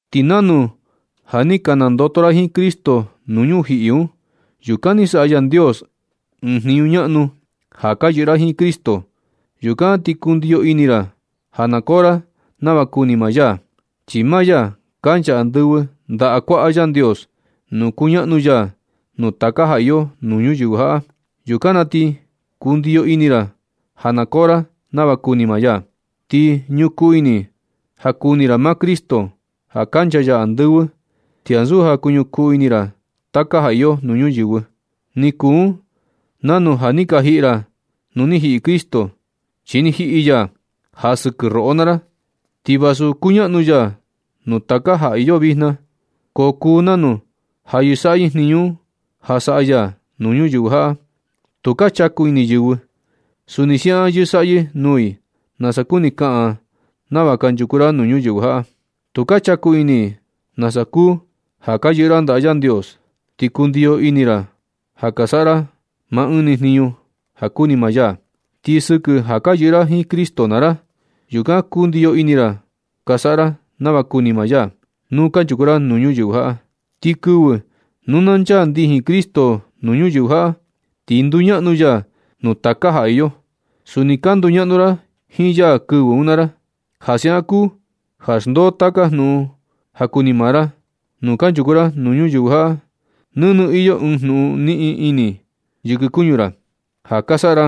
Ti nanu ja ni ka nandoto ra jiin Cristo nuu ñujiꞌi un, yukan ni saꞌa Yandios ɨɨn jniñu ñaꞌnu ja ka yɨꞌɨ ra jiin Cristo. Yukan ti kundiyo ini ra ja na koo ra nava kuni maa ya, chi maa ya kancha andɨvɨ ndaꞌa kuaꞌa Yandios nuu kuñaꞌnu ya nuu taka ja iyo nuu ñuyɨvɨ jaꞌa. Yukan na ti kundiyo ini ra ja na koo ra nava kuni maa ya. Ti kuñukuu ini ja kuni ra maa Cristo ja kancha ya andɨvɨ, ti ansu ja kuñukuu ini ra taka ja iyo nuu ñuyɨvɨ. Ni kuu un nanu ja ni ka jiꞌi ra nu ni jiꞌi Cristo, chi ni jiꞌi ya ja sɨkɨ roꞌo naa ra. Ti vasu kuñaꞌnu ya nuu taka ja iyo vijna, ko kuu nanu ja yɨsaꞌyɨ jniñu un ja saꞌa ya nuu ñuyɨvɨ jaꞌa. Tu ka chaku ini yɨvɨ. Suni siaꞌan yɨsaꞌyɨ nuu i nasa kuni kaꞌan nava kanchuku ra nuu ñuyɨvɨ jaꞌa. Tu ka chaku ini i nasa kuu ja ka yɨꞌɨ ra ndaꞌa Yandios, ti kundiyo ini ra ja ka saꞌa ra maa ɨɨn ni jniñu ja kuni maa ya. Ti sɨkɨ ja ka yɨꞌɨ ra jiin Cristo naa ra, yukan kundiyo ini ra ka saꞌa ra nava kuni maa ya nu kanchuku ra nuu ñuyɨvɨ jaꞌa. Ti kɨvɨ nu na nchaa ndijin Cristo nuu ñuyɨvɨ jaꞌa, ti nduñaꞌnu ya nuu taka ja iyo. Suni ka nduñaꞌnu ra jiin ya kɨvɨ un naa ra. Ja siaꞌan kuu ja xndoo taka jnuꞌun ja kuni maa ra. Nu kanchuku ra nuu ñuyɨvɨ jaꞌa nɨnɨ iyo ɨɨn jnuꞌun niꞌin ini yɨkɨ kuñu ra ja ka saꞌa ra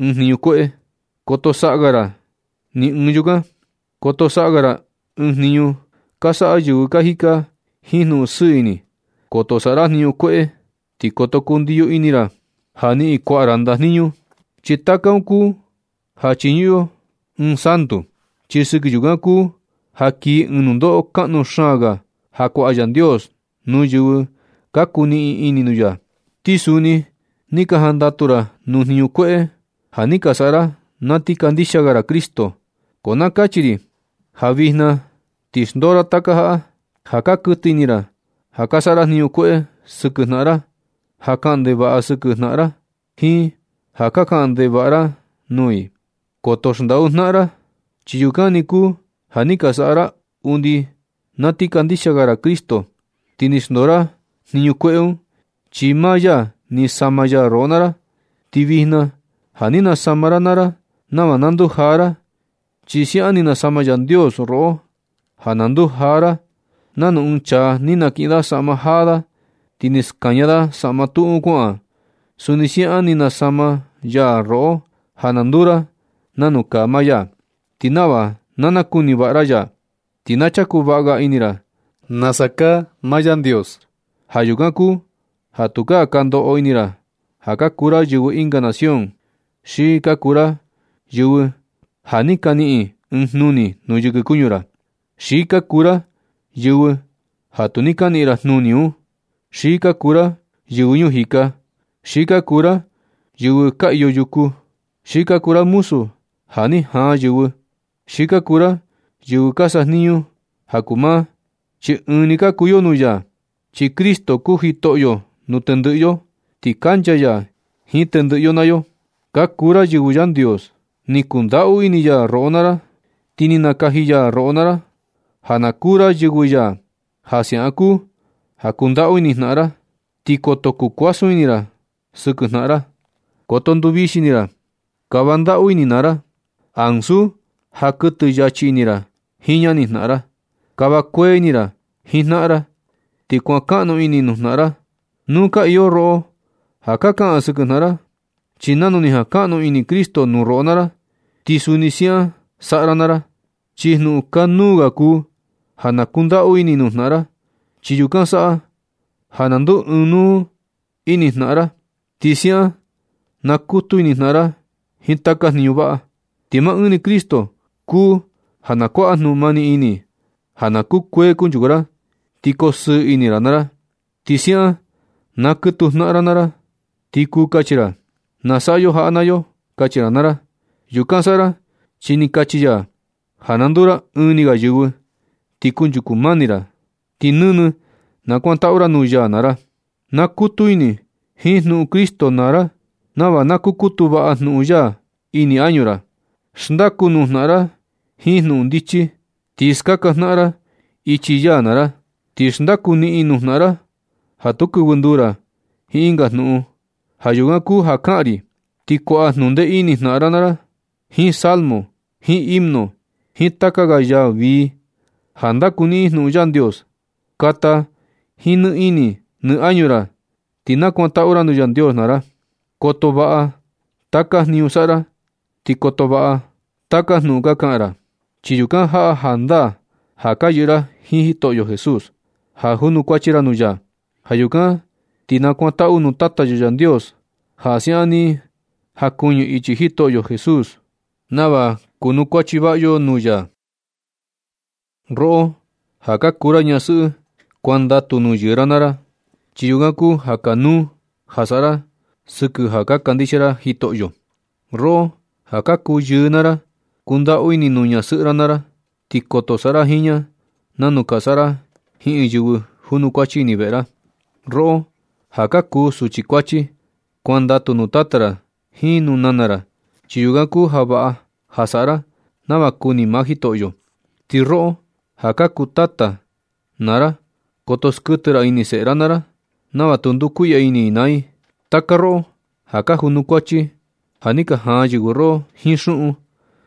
ɨɨn jniñu kueꞌe. Koto saꞌa ga ra ni ɨɨn yukan. Koto saꞌa ra ɨɨn jniñu ka saꞌa yɨvɨ ka jika jiin jnuꞌun sɨɨ ini. Koto saꞌa ra jniñu kueꞌe. Ti koto kundiyo ini ra ja niꞌin kuaꞌa ra ndajniñu. Chi taka un kuu ja chiñuꞌun yo ɨɨn santu. Chi sɨkɨ yukan kuu ja kii ɨɨn nundoꞌo kaꞌnu xaan ga ja kuaꞌa Yandios nuu yɨvɨ ka kuniꞌin ini nuu ya. Ti suni ni ka jandatu ra nuu jniñu kueꞌe ja ni ka saꞌa ra na ti kandixia ga ra Cristo. Ko na kachi ri ja vijna na, ti xndoo ra taka jaꞌa: ja ka kuɨtɨ ini ra, ja ka saꞌa ra jniñu kueꞌe sɨkɨ jnaꞌan ra, ja ka kaꞌan ndevaꞌa sɨkɨ jnaꞌan ra, jiin ja ka kaꞌan ndevaꞌa ra nuu i. Koto xndaꞌu ra jnaꞌan ra, chi yukan ni kuu ja ni ka saꞌa ra undi na ti kandixia ga ra Cristo, ti ni xndoo ra jniñu kueꞌe un. Chi maa ya ni sama ya roꞌo naa ra. Ti vijna ja ni nasama ra naa ra nava na ndujaa ra. Chi siaꞌan ni nasama Yandios roꞌo ja na ndujaa ra. Nanu ɨɨn chaa ni nakiꞌin da saꞌma jaa da, ti ni skaña da saꞌma tuꞌu un kuaꞌan, suni siaꞌan ni nasama ya roꞌo ja na nduu ra nanu kaa maa ya, ti nava na nakuni vaꞌa ra ya, ti na chaku vaꞌa ga ini ra nasa kaa maa Yandios. Ja yukan kuu ja tukaa ka ndoꞌo ini ra ja ka kuu ra yɨvɨ ɨnga nación, xi ka kuu ra yɨvɨ ja ni ka niꞌin ɨɨn jnuni nuu yɨkɨ kuñu ra, xi ka kuu ra yɨvɨ ja tu ni ka niꞌin ra jnuni un, xi ka kuu ra yɨvɨ ñuu jika, xi ka kuu ra yɨvɨ ka iyo yuku, xi ka kuu ra muzu ja ni jaan yɨvɨ, xi ka kuu ra yɨvɨ ka sajniñu jaku maa. Chi ɨɨn ni ka kuu yo nuu ya. Chi Cristo kuu Jitoꞌo nuu tendɨꞌɨ yo, ti kancha ya jiin tendɨꞌɨ yo naa yo. Ka kuu ra yɨvɨ Yandios. Ni kundaꞌu ini ya roꞌo naa ra, ti ni nakaji ya roꞌo naa ra ja ka kuu ra yɨvɨ ya. Ja siaꞌan kuu ja kundaꞌu ini jnaꞌan ra. Ti koto kukuasun ini ra sɨkɨ jnaꞌan ra. Koto nduvixi ini ra. Kava ndaꞌu ini naa ra, ansu ja kuɨtɨ yachi ini ra jiin ñani jnaꞌan ra. Kava kuee ini ra jiin jnaꞌan ra, ti kuankaꞌnu ini nuu jnaꞌan ra, nu ka iyo roꞌo ja ka kaꞌan sɨkɨ jnaꞌan ra. Chi nanu ni jankaꞌnu ini Cristo nuu roꞌo naa ra, ti suni siaꞌan saꞌa ra naa ra. Chi jnuꞌun kanuu ga kuu ja nu kundaꞌu ini nuu jnaꞌan ra, chi yukan saꞌa ja na nduu ɨɨn nuu ini jnaꞌan ra, ti siaꞌan nakutu ini jnaꞌan ra jiin taka jniñu vaꞌa. Ti maa ɨɨn ni Cristo kuu ja na kuaꞌa jnuꞌun mani ini ja na kukuee kunchuku ra, ti kosɨɨ ini ra naa ra. Ti siaꞌan na kɨtuu jnaꞌan ra naa ra, ti kuu kachi ra: “Na saꞌa yo jaꞌa naa yo”, kachi ra naa ra. Yukan saꞌa ra chi ni kachi ya ja na nduu ra ɨɨn ni ga yɨvɨ. Ti kunchuku mani ra. Ti nɨnɨ nakuantaꞌu ra nuu ya naa ra. Nakutu ini jiin jnuꞌun Cristo naa ra nava na kukutu vaꞌa jnuꞌun ya ini añu ra. Xndaku nuu jnaꞌan naa ra jiin jnuꞌun ndichi. Ti skaka jnaꞌan ra ichi ya naa ra. Ti xndaku niꞌin nuu jnaꞌan ra ja tu kɨvɨ nduu ra jiin ɨnga jnuꞌun. Ja yukan kuu ja kaꞌan ri, ti kuaꞌa jnuꞌun ndee ini jnaꞌan naa ra jiin salmo, jiin himno, jiin taka ga yaa vii ja ndakuniꞌin jnuꞌun Yandios. Kata jiin nɨ ini nɨ añu ra, ti na kuantaꞌu ra nuu Yandios naa ra. Koto vaꞌa taka jniñu ka saꞌa ra ti koto vaꞌa taka jnuꞌun ka kaꞌan ra, chi yukan jaꞌa jandaa ja ka yɨꞌɨ ra jiin Jitoꞌo Jesús, ja junukuachi ra nuu ya. Ja yukan ti nakuantaꞌu nuu Tata yo Yandios ja siaꞌan ni jankuɨñɨ ichi Jitoꞌo Jesús, nava kunukuachi vaꞌa yo nuu ya. Roꞌo ja ka kuu ra ñasɨꞌɨ, kuandatu nuu yɨɨ ra naa ra, chi yukan kuu ja kanuu ja saꞌa ra sɨkɨ ja ka kandixia ra Jitoꞌo. Roꞌo ja ka kuu yɨɨ naa ra, kundaꞌu ini nuu ñasɨꞌɨ ra naa ra, ti koto saꞌa ra jiin ña nanu ka saꞌa ra jiin ɨɨn yɨvɨ junukuachi ini veꞌe ra. Roꞌo ja ka kuu suchi kuachi, kuandatu nuu tata ra jiin nuu nana ra, chi yukan kuu ja vaꞌa ja saꞌa ra nava kuni maa Jitoꞌo. Ti roꞌo ja ka kuu tata naa ra, koto skuɨtɨ ra ini seꞌe ra naa ra nava tu ndukuiꞌya ini i naa i. Taka roꞌo ja ka junukuachi ja ni ka jaan yɨvɨ roꞌo jiin xuꞌun,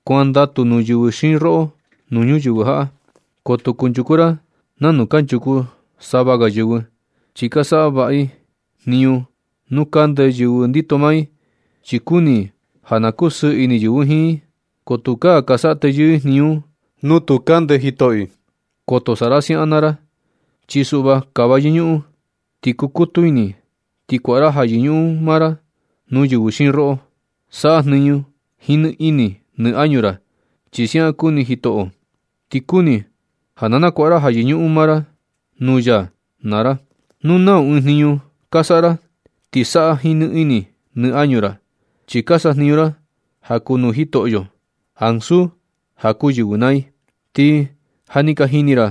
kuandatu nuu yɨvɨ xiin roꞌo nuu ñuyɨvɨ jaꞌa. Koto kunchuku ra nanu kanchuku sava ga yɨvɨ, chi ka saꞌa vaꞌa i jniñu nuu kande yɨvɨ ndito maa i, chi kuni i ja na kusɨɨ ini yɨvɨ jiin i. Ko tukaa ka saꞌa teyɨɨ i jniñu nu tu kande jitoꞌo i. Koto saꞌa ra siaꞌan naa ra, chi suꞌva kava yɨñuꞌun, ti kukutu ini ti kuaꞌa ra ja yɨñuꞌun maa ra nuu yɨvɨ xiin roꞌo. Saꞌa jniñu jiin nɨ ini nɨ añu ra, chi siaꞌan kuni Jitoꞌo, ti kuni ja na nakuaꞌa ra ja yɨñuꞌun maa ra nuu ya naa ra. Nu nau ɨɨn jniñu ka saꞌa ra, ti saꞌa jiin nɨ ini nɨ añu ra, chi ka sajniñu ra ja kuu nuu Jitoꞌo, ansu ja kuu yɨvɨ naa i. Ti ja ni ka jini ra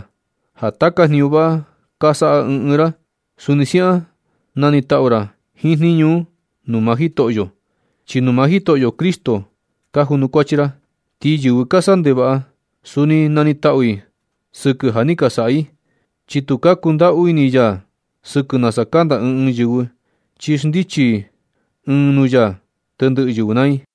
ja taka jniñu vaꞌa ka saꞌa ɨɨn ɨɨn ra, suni siaꞌan na nitaꞌu ra jiin jniñu un nuu maa Jitoꞌo, chi nuu maa Jitoꞌo Cristo ka junukuachi ra. Ti yɨvɨ ka saꞌa ndevaꞌa, suni na nitaꞌu i sɨkɨ ja ni ka saꞌa i. Chi tu ka kundaꞌu ini ya sɨkɨ nasa kanda ɨɨn ɨɨn yɨvɨ, chi xndichi ɨɨn nuu ya tendɨꞌɨ yɨvɨ naa i.